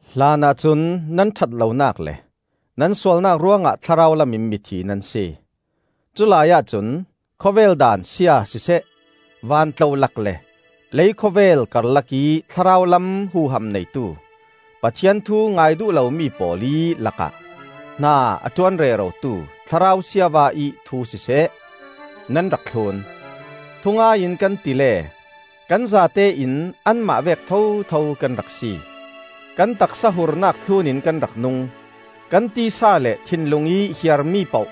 Hlanah cun nan ṭhatlonak le nan sualnak ruangah thlarau lamin mithi nan si. Culai ahcun khawvel daan sia siseh, van tlolak le lei khawvel karlakih thlarau lam huham neitu, Pathian thu ngai duh lomi pawl ih lakah hna a ṭuan rerotu thlarau siava ih thu siseh, nan rak thlun. Thungai in kan ti le kan zatein anmah vek thotho kan rak si; kan taksa hurnak thlunin kan rak nung, kan tisa le thinlung ih hiarmi poh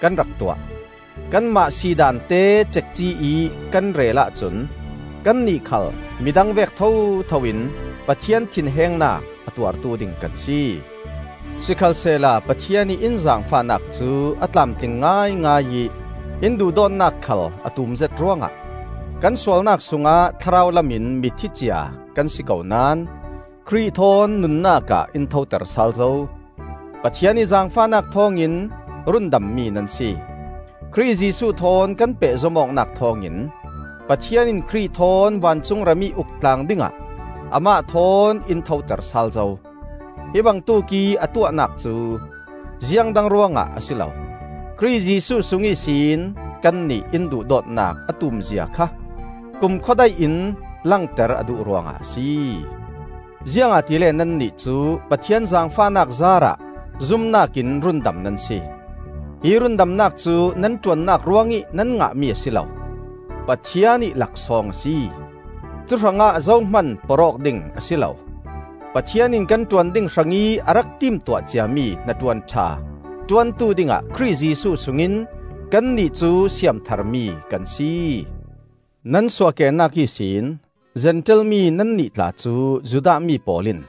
kan rak tuah. Kanmah si daan te cekci ih kan rel ahcun kannih khal midang vek thotho in Pathian thinhengnak a tuartu ding kan si. Sikhalsehla Pathian ih in zaangfahnak cu a tlamtling ngaingai ih in duhdawtnak khal a tumzet ruangah, kan sualnak sungah thlarau lamin mithi cia kan si ko naón Khrih thawn nunnak ah in thoter sal zo. Pathian ih zaangfahnak thawngin rundammi nan si. Khrih Jesuh thawn kan pehzom awknak thawngin Pathian in Khrih thawn vancung ramih uk tlang dingah amah thawn in thoter sal zo. Hi bangtuk ih a tuahnak cu ziangdang ruangah a si lo; Khrih Jesuh sung ihsin kannih in duhdawtnak a tumzia kha kumkhua daih in langter a duh ruangah a si. Ziangahtile nannih cu Pathian zaangfahnak zaarah zumnak in rundam nan si. Hi rundamnak cu nan ṭuannak ruangih nan ngahmi a si lo, Pathian ih laksawng a si. Cuhrangah zo hman porh awk ding a si lo. Pathian in kan ṭuan ding hrangih a rak timtuah ciami hnaṭuan ṭha ṭuantu dingah Khrih Jesuh sungin kannih cu siamtharmi kan si. Nan suahkehnak ihsin Zentail mi nannih tla cu Judah mi pawl in,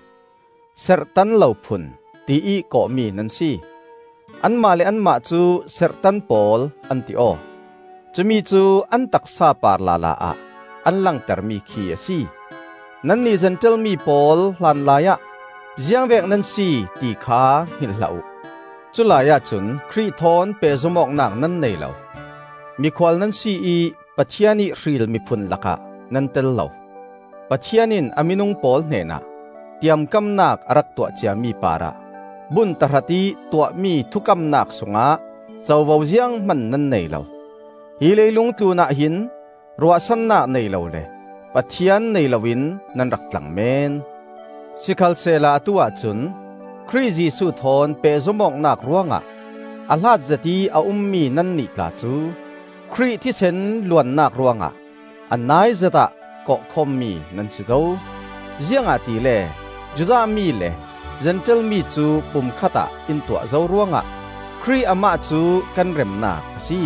“Serhtan lo phun,” tiih kawhmi nan si; anmah le anmah cu, “Serhtan pawl,” an ti aw. (Cumi cu an taksa par lala ah an langter mi khi a si.) Nannih Zentail mi pawl hlanlai ah ziangvek nan si, ti kha hngilh hlah uh. Culai ahcun Khrih thawn pehzom awknak nan nei lo. Mikhual nan si ih Pathian ih hril miphun lakah nan tel lo. Pathian in a minung pawl hnenah tiamkamnak a rak tuah ciami parah bun tahratih tuahmi thukamnak sungah covo zianghman nan nei lo. Hi leilung tlunah hin ruahsannak nei lo le Pathian nei loin nan rak tlang meen. Sikhalsehla atu-ah cun Khrih Jesuh thawn pehzom awknak ruangah a hlatzet ih a ummi nannih tla cu Khrih thisen luannak ruangah a naizetah kawh khawmmi nan si zo. Ziangahtile Judah mi le Zentail mi cu pumkhat ah in tuah zo ruangah Khrih amah cu kan remnak a si.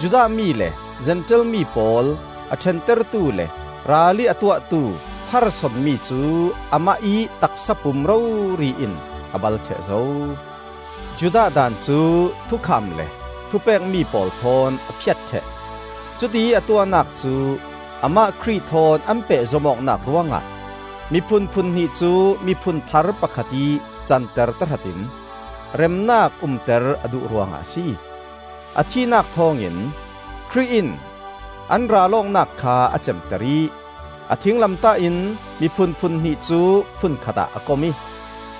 Judah mi le Zentail mi pawl a ṭhentertu le ralih a tuahtu pharsonmi cu amah ih taksa pum rori in a bal ṭheh zo. Judah daan cu thukham le thupekmi pawl thawn a phiat ṭheh. Cutiih a tuahnak cu amah Khrih thawn an pehzom awknak ruangah miphun phunhnih cu miphun thar pakhat ih canter tahratin remnak umter a duh ruangah a si. A thihnak thawngin Khrih in an ral awknak kha a cemter ih a thinglamtah in miphun phunhnih cu phun khatah a kom ih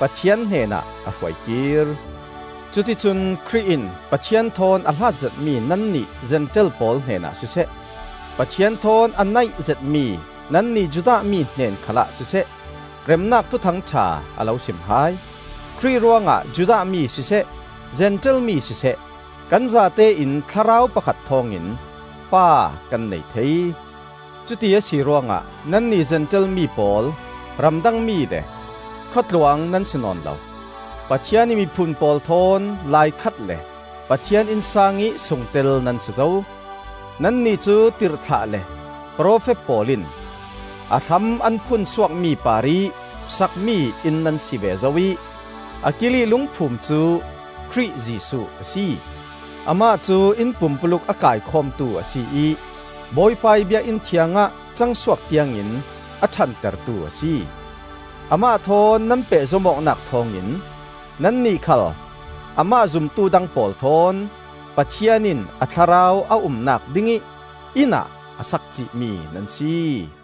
Pathian hnenah a hruai kir. Cuticun Khrih in Pathian thawn a hlat zetmi nannih Zentail pawl hnenah siseh, Pathian thawn a naih zetmi nannih Judah mi hnen khalah siseh, remnak Thuthang ṭha a lo sim hai. Khrih ruangah Judah mi siseh, Zentail mi siseh, kan zatein Thlarau pakhat thawngin Pa kan nei thei. Cuti a si ruangah nannih Zentail mi pawl ramdangmi le khuatluang nan si nawn lo; Pathian ih miphun pawl thawn laikhat le Pathian innsang ih sungtel nan si zo. Nannih cu tirhthlah le profet pawl in a hram an phun suakmi parih sakmi inn nan si ve zo ih a kiilih lungphum cu Khrih Jesuh a si. Amah cu inn pumpuluk a kaikhawmtu a si ih Bawipa ih biakinn thiangah cangsuak tiangin a ṭhantertu a si. Amah thawn nan pehzom awknak thawngin nannih khal amah zumtu dang pawl thawn Pathian in a Thlarau a umnak dingih innah a sak cihmi nan si.